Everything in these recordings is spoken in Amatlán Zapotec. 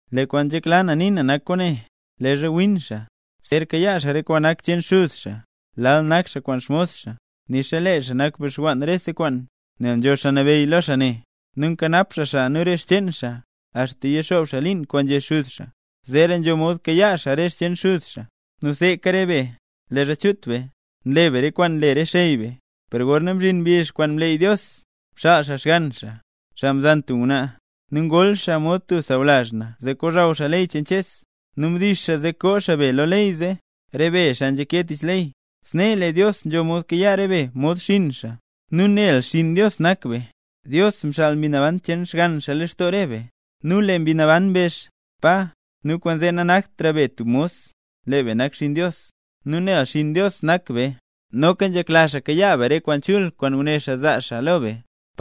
Lee kwaan nzhekla na nii na nak kwaane: Leezha win xaa, zer kayaa xaa re kwaan nak cheen xuz xaa, lal nak xaa kwaan xmos xaa, nixa lee xaa nak bixwann rese kwaan. Nel nzho xaa nabeyy lo xaa ne, nu nkanap xaa xaa nu re xcheen xaa, axta yixoob xaa liin kwaan nzhé xuz xaa, zeera nzho mod kayaa xaa re xcheen xuz xaa. Nu seeka re be, leezha chut be, nle be rese kwaan nle re xey be. Per gorna mzhin mbizh kwaan mleey Dios, mxaal xaa Xgann xaa, xaa mzan tub ngwnaa; nu ngol xaa mod tub sawlazh na zee kozhaw xaa ley cheen Ches. Nu mdix xaa zee koo xaa be lo ley zee, re be xaa nzhake tich ley zee, snee lee Dios nzho mod kayaa re be mod xinn xaa. Nu nel xinn Dios nak be, Dios mxaal Mbi Naban cheen Xgann xaa lextoo re be, nu lee Mbi Naban mbezh: “¡Pa!” Nu kwaanzee nanaktra be tub mos, lee be nak xinn Dios, nu nel xinn Dios nak be, noka nzhekla xaa kayaa be re kwaan chul kwaan nguné xaa zaa xaa lo be.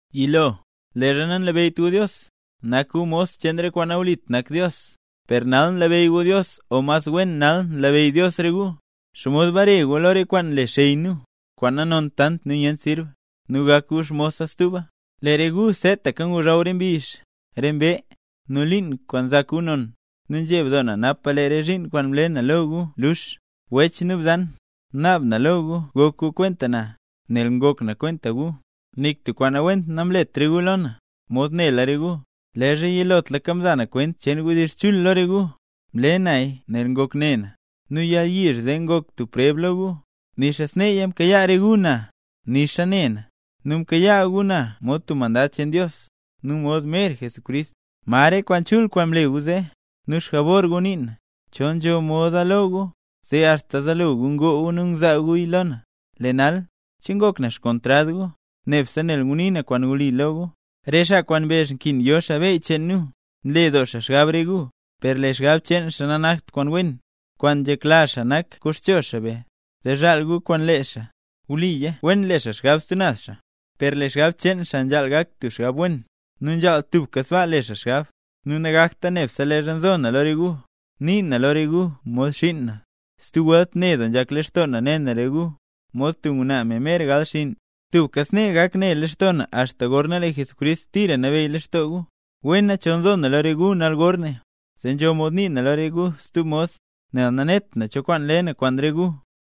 Yilo, leezha nanlabeyyt gu Dios, nak gu mos cheen re kwaan nawlit nak Dios. Per nal nlabeyy gu Dios o mas wen nal nlabeyy Dios re gu, ¿xomod bare gu lo re kwaan nle xey nu, kwaan nanont tant nu nyent sirb, nu gak gu xmosa stuba? Lee re gu seetaka ngozhaw re mbizh, re mbee, nu liin kwaan nzak gu non. ¡Nu nzheb doo na napa lee re zhiin kwaan mle na lo re gu luux! Wech nu bzan, naab na lo gu gok gu kwenta na, nel ngok na kwenta gu. Nik tub kwaan nawent namlet re gu lo na, mod nela re gu. Leezha yilotlaka mza na kwent cheen wdizh chul lo re gu, mle naya nel ngok ne na. Nu yalyizh zee ngok tub preb lo gu, nixa sneeya mkayaa re gu na, nixa ne na; nu mkayaa gu na mod tub mandad cheen Dios, nu mod mer Jesucrist. ¿Ma re kwaan chul kwaan mle gu zee? Nu xjabor gu nii na, chol nzho moda lo gu, zee axta zaalo gu ngoo gu ngzaa guya lo na. Lee nal, ¿che ngok na xkontrad gu, nebse nel ngunii na kwaan wli lo gu? Re xaa kwaan mbezh nkin yo xaa beyy cheen nu, nle doo xaa xgab re gu, per lee re xgab cheen xaa nanakt kwaan wen. Kwaan nzhekla xaa nak koxcho xaa be, zee zhaal gu kwaan lee xaa. Wliya wen le xaa xgab stub naz xaa, per lee xgab cheen xaa nzhaal gak tub xgab wen, nu nzhaal tubka sbaa le xaa xgab; nu nagakta nebse leezha nzo na lo re gu. Nii na lo re gu mod xiin na, stub welt ne doo nzhak lextoo na ne na re gu, mod tub ngwnaa, me mer gal xinn; nu tubka snee gak ne lextoo na axta gorna lee Jesucrist tira nabeyy lextoo gu. ¡Wena chol nzo na lo re gu nal gorne, zee nzho mod nii na lo re gu stub mod, nel nanet na cho kwaan le na kwaan re gu!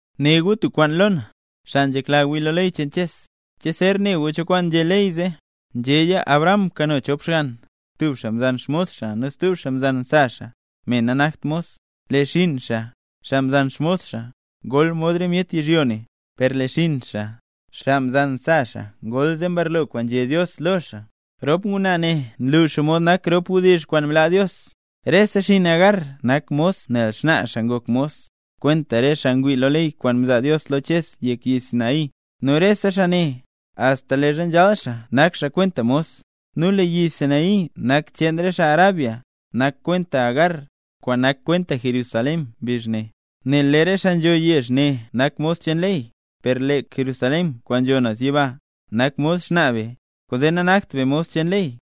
Né gu tub kwaan lo na, xaa nzhekla wii lo ley cheen Ches; ¿che zer ne gu cho kwaan nzhé ley zee? Nzhéya Abraham mkano chop xgann; tub xaa mzan xmos xaa, nu stub xaa mzan sa xaa, me nanakt mos. Lee xinn xaa, xaa mzan xmos xaa, ngol mod re myet yizhyo ne, per lee xinn xaa, xaa mzan sa xaa ngol zee mbarlo kwaan nzhé Dios lo xaa. Rop ngwnaa ne nlu xomod nak rop wdizh kwaan mlaa Dios, Rese xinn Agar nak mos nel xnaa xaa ngok mos, kwenta re xaa ngwii lo ley kwaan mzaa Dios lo Ches yek yi Sinaí. Nu rese xaa ne, axta leezha nzhal xaa nak xaa kwenta mos. Nu lee yi Sinaí kwaan nak cheen xaa Arabia, nak kwenta Agar, kwaan nak kwenta Jerusalén mbizh ne, nel lee re xaa nzho yezh ne nak mos cheen ley. Per lee Jerusalén kwaan nzho naz yiba, nak mod xnaa be, kwaanzee nanakt be mos cheen ley.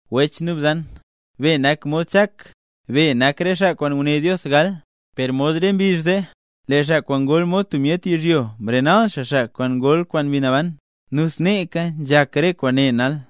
Wech nu bzan, be nak mod Chak; be nak re xaa kwaan nguné Dios gal. Per mod re mbizh zee, lee xaa kwaan ngol mod tub myet yizhyo mrenal xaa xaa kwaan ngol kwaan Mbi Naban, nu sneeka nzhak re kwaane nal.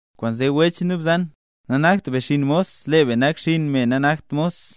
Kwaanzee wech nu bzan, nanakt be xinn mos, lee be nak xinn me nanakt mos.